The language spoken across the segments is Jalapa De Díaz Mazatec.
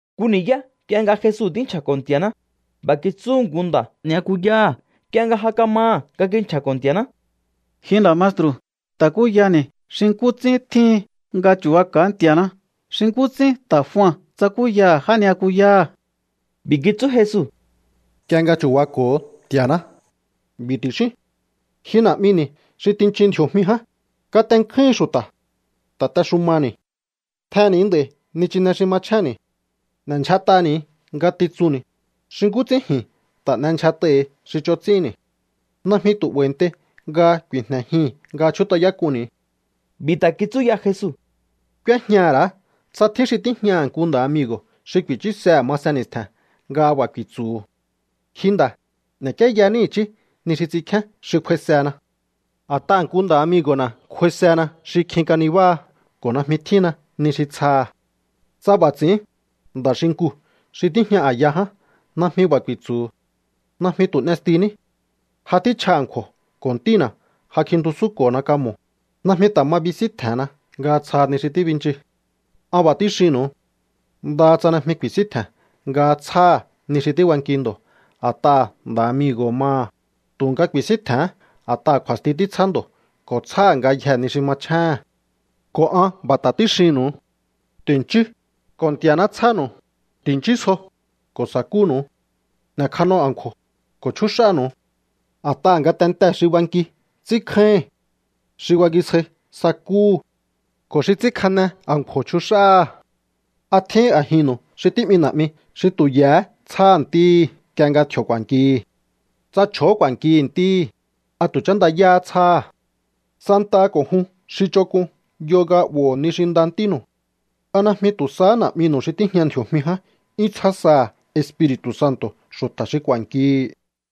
Nku ni̱yá nk'ie nga Jesu tínchja̱ko̱ Nti̱a̱ná, b'a̱ kitsúhu̱ nku nda̱ já ni'yakuyáha̱ nk'ie nga ja kamaha̱ nga kinchja̱ko̱ Nti̱a̱ná: —Ji nda̱ maestru̱, ta̱kúyani̱ xi nkú ts'ín tjíhin nga chu̱baka̱á Nti̱a̱ná, xi nkú ts'ín ta̱ Jua tsakúyaha̱ já ni'yakuyáha̱. B'i̱ kitsú Jesu: —Nk'ie nga chu̱bako̱o Nti̱a̱ná, b'i̱ ti̱xíún: Ji Na̱'mini̱ xi tinchin ndji̱o̱jmi ján, katenkjúhin xu̱ta̱. Ta̱texumani̱. Tjenni̱ nd'a̱i̱ nichine xi machjénni̱. N'e̱ndyjat'ani̱ ngatitsunni̱, xi nkú ts'ín ji̱n ta̱ n'endyjat'ai̱hi̱ xi ch'on ts'ínni̱. Najmi tu̱ 'ba̱i̱ntei nga ku̱i̱jne̱jii̱n nga chjút'ayák'unni̱. B'i̱ ta̱ kitsú ya Jesu: —K'úéjñaha̱ ra̱á tsa tjín xi tíjñaha̱ nku nda̱ amigo̱ xi ku̱i̱chúsehe̱ masen ni̱stje̱n nga b'a̱ ku̱i̱tsu̱hu̱: “Ji nda̱, n'e̱k'ieyaní i̱chí ni xi ts'inkjén xi kj'uaisena. A̱t'aha̱ nku nda̱ amigo̱na̱ kj'uaisena xi kjin kanibáha ko̱ najmi tjínna ni xi tsjaha̱.” Tsa b'a̱ ts'i̱ín, nda̱ xinkuu̱ xi tíjña a̱ya ján najmi b'a̱ ku̱i̱tsu̱hu̱: “Najmi tu̱ n'estiní. Ja tjíchja a̱nkju̱o̱ ko̱ ntína̱ ja kjintusúnko̱na kamo̱. Najmi ta̱ ma bisíntje̱henna nga tsjaha ni xi tíbinchi.” An b'a̱ tíxinnu̱u. Ndaha tsa najmi ku̱i̱síntje̱n nga tsjáha̱ ni xi tíbanki ndo̱ a̱t'aha̱ nda̱ amigo̱ho̱ maha, tu̱nga ku̱i̱síntje̱hén a̱t'aha̱ kju̱a̱sti títsjá ndo̱ ko̱ tsjáha̱ ngayjee̱ ni xi machjéhe̱n. ’Ko̱ an b'a̱ ta̱ tíxinnu̱u. Ti̱nchíú, ko̱ Nti̱a̱ná tsjánu̱u. Ti̱nchísjo, ko̱ sa̱kúnu̱u. N'e̱kjano a̱nkju̱o̱, ko̱ chjúx'ánu̱u. A̱t'aha̱ ngatentee̱ xi banki ts'ínkjáíhi̱n. Xi bangisjai sakúhu̱. Ko̱ xi ts'ínkjane a̱nkju̱o̱ chjux'áha̱. ¿A tjín a̱jinnu̱u xi tí'mi na̱'mi xi tu̱ ye̱hé tsjáha̱ ntíhi nk'ie nga tji̱o̱ ku̱a̱nkihi̱? Tsa chj'o̱ó ku̱a̱nki ntíhi̱, ¿a tu̱ chándayáhá tsjáha̱? Santaha ko̱ jun xi ch'onk'un yo nga 'bo̱ho̱o ni xi nda ntínu̱u. ¿A najmi tu̱ sahá Na̱'minu̱u xi tíjña ndji̱o̱jmi ján 'yún tsjá saha̱ Espiri̱tu̱ Santo̱ xu̱ta̱ xi ku̱a̱nkihi̱?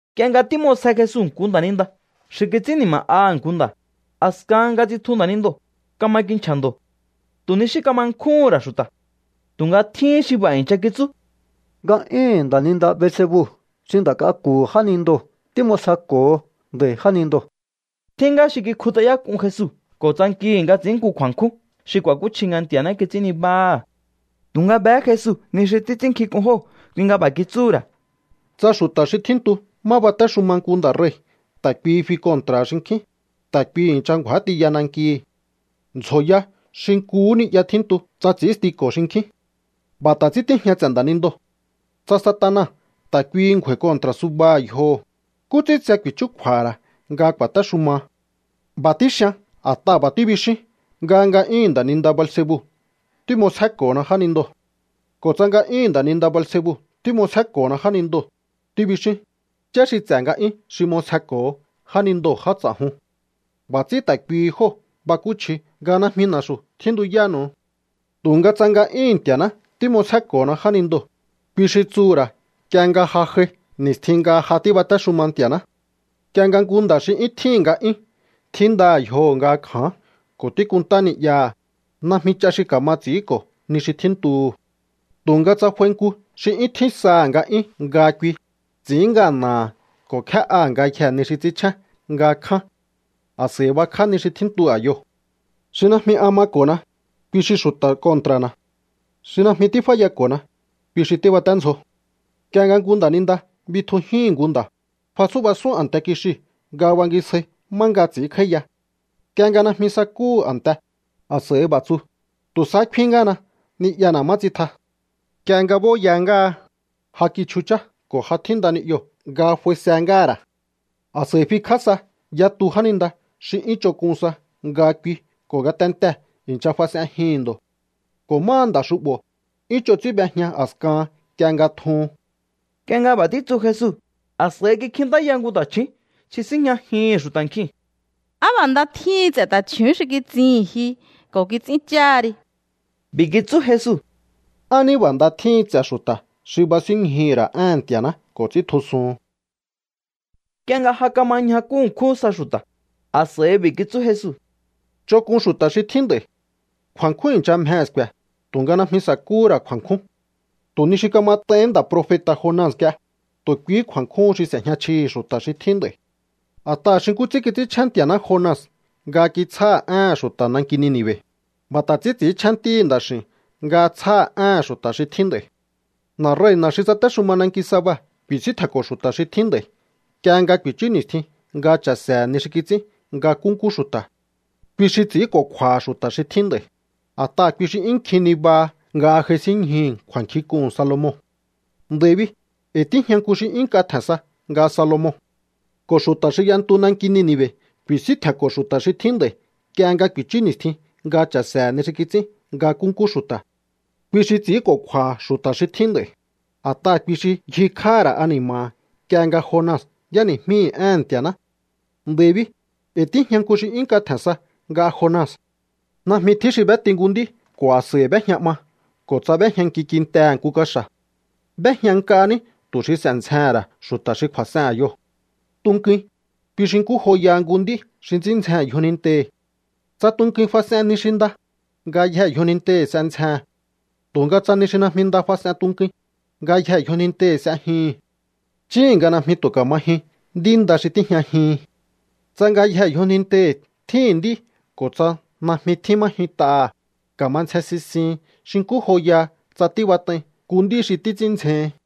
Nk'ie nga tím'osje Jesu nku nda̱ninda xi kits'ín ni̱ma̱'aha̱ nku nda̱, a̱skahan nga tsitju nda̱nindoo̱, kama kinchja̱ ndo̱. Tu̱ ni xí kama nkjúhún ra̱ xu̱ta̱. Tu̱nga tjíhín xi b'a̱ i̱ncha kitsú: —Nga'yúhu̱n nda̱ninda Beelzebu xi nda̱ k'aku̱hu̱ jánindoo̱ tím'osjeko̱ho nda̱i̱ jánindoo̱. Tjín ngá xi kikjut'ayák'un Jesu ko̱ tsankihi̱ nga ts'i̱ín nku kju̱a̱nkjún xi ku̱a̱kúchji nga Nti̱a̱ná kits'ín nibáha̱. Tu̱nga behé Jesu ni xi títs'ínnkjink'un jóo̱, kui nga b'a̱ kitsúhu̱ ra̱: —Tsa xu̱ta̱ xi tjíntu má batéxuma nku nda̱ rei̱ ta̱ kuihi fi kontra̱ha̱ xinkjín, ta̱ kuihi i̱ncha ngju̱á tiya nankihi̱. Ndzjoya xi nkuhú ni'ya tjíntu tsa ts'ínstiko̱ xinkjín. B'a̱ ta̱ ts'ín tíjña ts'e̱ nda̱nindoo̱. Tsa Satana ta̱ kuihi ngju̱a̱i̱ kontra̱ subaha̱ yjoho̱, ¿nkú ts'ín tse ku̱i̱chúkju̱a̱ha̱ ra̱ nga ku̱a̱téxuma? B'a̱ tíxian a̱t'aha̱ b'a̱ tíbixíún nga nga'yúhu̱n nda̱ninda Beelzebu tím'osjéko̱hona jánindoo̱. Ko̱ tsa nga'yúhu̱n nda̱ninda Beelzebu tím'osjéko̱hona jánindoo̱, tíbixíún, ¿yá xi ts'e̱ nga'yún xi m'osjeko̱ho jánindoo̱ já ts'a̱jun? B'a̱ ts'ín ta̱ kuihi jóo̱ bakúchji nga najmi na̱xu̱ tjíntuyánu̱u. Tu̱nga tsa nga'yúhu̱n Nti̱a̱ná tím'osjéko̱hona jánindoo̱, kui xi tsuhu̱ ra̱ nk'ie nga ja j'ai ni̱stjin nga ja tíbatéxuma Nti̱a̱ná. ’Nk'ie nga nku nda̱ xi 'yún tjíhi̱n nga'yún tjíndaha̱ yjoho̱ nga kja̱án ko̱ tíkunntá ni'yaha̱, najmi ch'a xi ka̱ma ts'i̱ínko̱ ni xi tjíntuhu̱. Tu̱nga tsa f'ai nku xi 'yún tjín saha̱ nga'yún nga kui, ts'i̱ín ngana̱ha̱ ko̱ kje'áha̱ ngayjee̱ ni xi ts'ínchjén nga kján. A̱s'a̱i bakj'á ni xi tjíntu a̱yoo̱. Xi najmi an mako̱na, kui xi xu̱ta̱ kontra̱na̱. Xi najmi tíf'áyako̱na, kui xi tíbaténdzjo. ’Nk'ie nga nku nda̱ninda bitjujíhi̱n nku nda̱, fatsú'basún a̱nte kixiu̱ nga bangisjai má nga ts'i̱ínkj'áíya. Nk'ie nga najmi sakúhu̱ a̱nte, a̱s'a̱i b'a̱ tsu: “Tu̱ sahá kfin ngáhana ni'yana̱ má tsitja.” Nk'ie nga b'óya ngáha, ja kichjuchá ko̱ ja tjínda ni'yoo̱ nga f'aise ngáha̱ ra̱. A̱s'a̱i fikj'á sa yatu jáninda xi 'yún ch'onk'un sa nga kui ko̱ ngatentee̱ i̱ncha fas'enjihi̱n ndo̱. Ko̱ máha nda̱ xu'bo̱, 'yún ch'on ts'ín b'ejña a̱skahan nk'ie nga tjuhun. Nk'ie nga b'a̱ títsu Jesu, a̱s'a̱i kikjintáya nku ta̱chju̱ún xi síjñajihi̱n xu̱ta̱ nkjiu̱n: —¡Á b'a̱ nda tjíhin ts'e̱ ta̱chju̱ún xi kitsihi̱n ji ko̱ kits'íncháha ri! B'i̱ kitsú Jesu: —¡Á ní b'a̱ nda tjíhin ts'e̱ xu̱ta̱ xi basínñjuhu̱ ra̱ éhe̱n Nti̱a̱ná ko̱ ts'íntjusun! Nk'ie nga ja kama ñjakú ṉkjún sa xu̱ta̱, a̱s'a̱i b'i̱ kitsú Jesu: —Ch'onk'un xu̱ta̱ xi tjín nd'a̱i̱. Kju̱a̱nkjún i̱ncha mjehe̱ sku̱e̱, tu̱nga najmi sa̱kúhú ra̱ kju̱a̱nkjún. Tu̱ ni xi kamat'aihín nda̱ profeta̱ Jona nk'ie, tu̱ kuihí kju̱a̱nkjún xi s'e̱jña chjihi̱ xu̱ta̱ xi tjín nd'a̱i̱. A̱t'aha̱ xi nkú ts'ín kits'ínchjén Nti̱a̱ná Jona nga kitsjáha̱ éhe̱n xu̱ta̱ nanki Nini̱ve̱, b'a̱ ta̱ ts'ín ts'i̱ínchjén Ntíhi̱ Nda̱x'i̱u̱n nga tsjáha̱ éhe̱n xu̱ta̱ xi tjín nd'a̱i̱. ’Na̱rei̱na̱ xi tsatéxuma nanki Saba ku̱i̱síntje̱nko̱ xu̱ta̱ xi tjín nd'a̱i̱ nk'ie nga ku̱i̱chú ni̱stjin nga cha̱se̱he̱ ni xi kits'ín nga nkúnkú xu̱ta̱. Kui xi ts'i̱ínko̱kju̱a̱ha̱ xu̱ta̱ xi tjín nd'a̱i̱, a̱t'aha̱ kui xi 'yún kjin nibaha nga j'aisínñjuhu̱ kju̱a̱nkjink'uhu̱n Salomon. Nd'a̱i̱ bi, e̱i̱ tíjña nku xi 'yún nk'a tje̱n sa nga Salomon. Ko̱ xu̱ta̱ xi y'entu nanki Nini̱ve̱ ku̱i̱síntje̱nko̱ xu̱ta̱ xi tjín nd'a̱i̱ nk'ie nga ku̱i̱chú ni̱stjin nga cha̱se̱he̱ ni xi kits'ín nga nkúnkú xu̱ta̱. Kui xi ts'i̱ínko̱kju̱a̱ha̱ xu̱ta̱ xi tjín nd'a̱i̱, a̱t'aha̱ kui xi ngjikj'áha̱ ra̱ ani̱ma̱ha̱ nk'ie nga Jona y'éni̱jmíhi̱ éhe̱n Nti̱a̱ná. Nd'a̱i̱ bi, e̱i̱ tíjña nku xi 'yún nk'a tje̱n sa nga Jona. ’Najmi tjín xi b'éti nku nd'í ko̱ a̱s'a̱i b'éjña 'ma ko̱ tsa b'éjñanki kintehe̱ nku kaxa̱. B'éjña nk'a ní tu̱ xi s'e̱ ndzjehe̱n ra̱ xu̱ta̱ xi kju̱a̱s'ehen a̱yoo̱. Tunkuin, kui xi nkú joyaha nku nd'í xi ts'ín ndzjehe̱n yjonintehi̱. Tsa tunkuin fas'en ni xi nda, ngayjee̱ yjonintehi̱ s'e ndzjehe̱n. Tu̱nga tsa ni xi najmi nda fas'en tunkuin, ngayjee̱ yjonintehi̱ s'e jyuhu̱n. Chíhi̱n nga najmi tu̱ ka̱ma jyun nd'í nda xi tíjñajihin. Tsa ngayjee̱ yjonintehi̱ tjíhi̱n nd'í ko̱ tsa najmi tjín má jyunt'aha̱, ka̱ma ndzjen sisihin xi nkú joyaha tsa tíbat'ai nku nd'í xi títs'ín ndzjehin.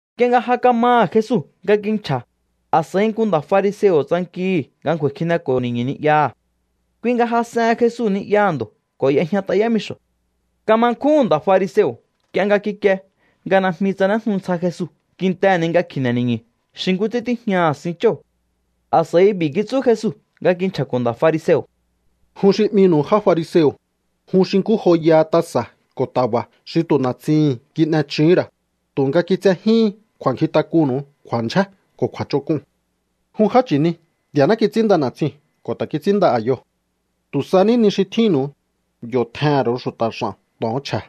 Nk'ie nga ja kamaha̱ Jesu nga kinchja̱, a̱s'a̱i nku nda̱ fariseo̱ tsankihi̱ nga ngju̱a̱i̱ kjineko̱ho̱ ni̱ñu̱ ni'yaha̱. Kui nga jas'ehen Jesu ni'yaha̱ ndo̱ ko̱ y'ejñat'a yámixo̱. Kama nkjúhu̱n nda̱ fariseo̱ nk'ie nga kikie nga najmi tsanéjnu ntsja Jesu kintehe̱ ni nga kikjine ni̱ñu̱ xi nkú ts'ín tíjñaha̱ sinchóo̱. A̱s'a̱i b'i̱ kitsú Jesu nga kinchja̱ko̱ nda̱ fariseo̱: —Jun xi 'minu̱u já fariseo̱, jun xi nkú joyaha tasa̱ ko̱ ta̱ba̱ xi tu̱ na̱tsihi̱n kin'echuhún ra̱, tu̱nga kitsejíhín kju̱a̱nkjintak'unnu̱u kju̱a̱ndyjé ko̱ kju̱a̱ch'onk'un. ¡Jun já chi̱ni! Nti̱a̱ná kits'ínnda na̱tsiu̱n ko̱ ta̱ kits'ínnda a̱yoo̱. Tu̱ sa ní ni xi tjínnu̱u, yo̱ tjehe̱n ru̱u xu̱ta̱ x'a̱n to̱on chje̱.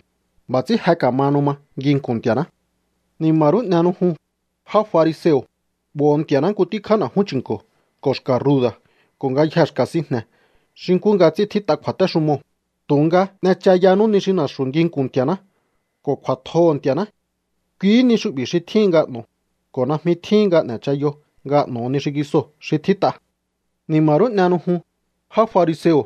B'a̱ ts'ín je ka̱mahanu ma nginku̱n Nti̱a̱ná. ’¡Ni̱ma̱ rú n'ehenu jun, já fariseo̱! 'Bo̱ho̱ Nti̱a̱ná nku tíkjá na̱jún chi̱nko̱ ko̱ xka̱ ruda̱ ko̱ ngayjee̱ xka̱ sinjne̱ xi nkú nga ts'ín tjít'a kju̱a̱téxumoo̱, tu̱nga n'echayanú ni xi na̱xu̱ nginku̱n Nti̱aná ko̱ kju̱a̱tjoho̱ Nti̱a̱ná. Kuihí ni xu'bi̱ xi tjíhin nga n'o̱o, ko̱ najmi tjíhin nga n'e̱chayo nga n'o̱o ni xingisoo̱ xi tjít'a. ¡Ni̱ma̱ rú n'ehenu jun, já fariseo̱!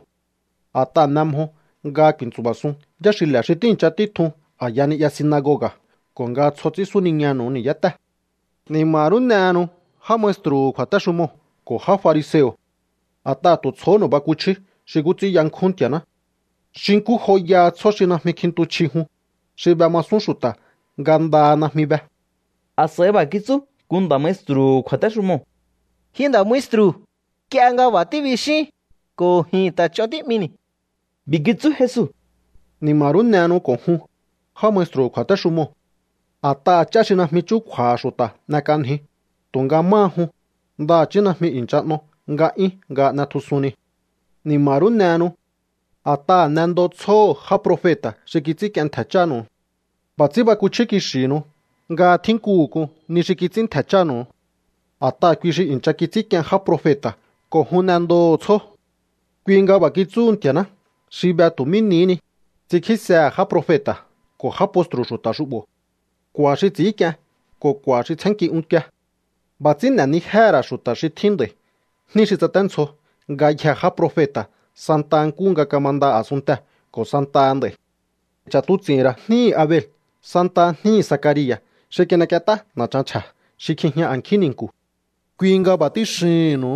A̱t'aha̱ n'e mjo nga ku̱i̱ntsu̱ba̱sun yáxile̱ xi tíi̱ncha títjun a̱ya ni'ya sinagoga̱ ko̱ nga tsjo ts'ín súniñanu̱u ni̱yátée̱. ¡Ni̱ma̱ rú n'ehenu, já maestru̱hu̱ kju̱a̱téxumoo̱ ko̱ já fariseo̱! ¡A̱t'aha̱ tu̱ tsjohónu̱u bakuchíú xi nkú ts'ín yankjún Nti̱a̱ná! Xi nkú joyaha tsjó xi najmi kjintu chji jun, xi b'emasún xu̱ta̱ nga ndaha najmi be. A̱s'a̱i b'a̱ kitsú nku nda̱ maestru̱hu̱ kju̱a̱téxumoo̱: —Ji nda̱ maestru̱, nk'ie nga b'a̱ tíbixín, ko̱ ji̱n ta̱ ch'on tí'mini̱. B'i̱ kitsú Jesu: —¡Ni̱ma̱ rú n'ehenu ko̱ jun, já maestru̱hu̱ kju̱a̱téxumoo̱! A̱t'aha̱ ch'á xi najmi chúkju̱a̱ha̱ xu̱ta̱ n'ek'anjiu, tu̱nga máha jun, ndaha̱chí najmi i̱ncha n'o nga'yún nga n'etjusun niu̱. ¡Ni̱ma̱ rú n'ehenu! A̱t'aha̱ n'endo tsjóho̱ já profeta̱ xi kits'ínk'ien ntje̱ chánu̱u. B'a̱ ts'ín bakuchjí kixi̱hinu nga tjínkuhu̱ k'un ni xi kits'ín ntje̱ chánu̱u. A̱t'aha̱ kui xi i̱ncha kits'ínk'ien já profeta̱ ko̱ jun n'endoho̱o tsjó. ’Kui nga b'a̱ kitsúhu Nti̱a̱ná xi be tu̱ mí nihí ni: “Ts'inkjísehe̱ já profeta̱ ko̱ já postru̱ xu̱ta̱ xu'bo̱. K'u̱a̱ xi ts'i̱ínk'ien ko̱ k'u̱a̱ xi tsjénnki unkie.” B'a̱ ts'ín n'e̱nijéhe̱ ra̱ xu̱ta̱ xi tjín nd'a̱i̱ jní xi tsaténdzjo ngayjee̱ já profeta̱ santa nkúhu nga kamanda a̱sunntee̱ ko̱ santaha nd'a̱i̱. Ch'a̱tuts'i̱hi̱n ra̱ jníhi̱ Abel santaha jníhi̱ Zacaria̱ xi kin'ek'ient'á na̱chan chje̱ xi kjijña a̱nkjín ni̱nku̱. Kui nga b'a̱ tíxihi̱nnu̱u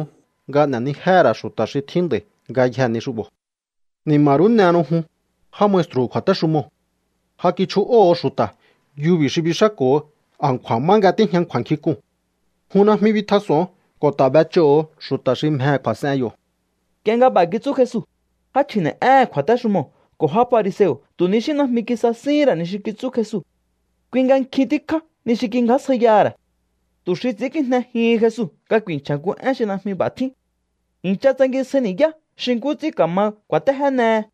nga n'e̱nijéhe̱ ra̱ xu̱ta̱ xi tjín nd'a̱i̱ ngayjee̱ ni xu'bo̱. ¡Ni̱ma̱ rú n'ehenu jun, já maestru̱hu̱ kju̱a̱téxumoo̱! Ja kichju'óho̱o xu̱ta̱ yubi̱ xi bix'áko̱ho a̱nkju̱a̱ má nga tíjña kju̱a̱nkjink'uu̱n. Jun najmi bitjas'o̱on ko̱ ta̱ b'ech'óho̱o xu̱ta̱ xi mjehe̱ kju̱a̱s'en yo̱. Nk'ie nga b'a̱ kitsú Jesu, já chji̱ne̱'éhe̱n kju̱a̱téxumoo̱ ko̱ já fariseo̱ tu̱ ni xí najmi kisasíhín ra̱ ni xi kitsú Jesu. Kui nga nkjin tíkjá ni xi kingjásjaiyaha̱ ra̱ tu̱ xi ts'i̱ínkijnejihin Jesu nga ku̱i̱nchja̱ nku én xi najmi b'a̱ tjín. I̱ncha tsangisjai ni̱yá xi nkú ts'ín ka̱ma kju̱a̱téjénehe.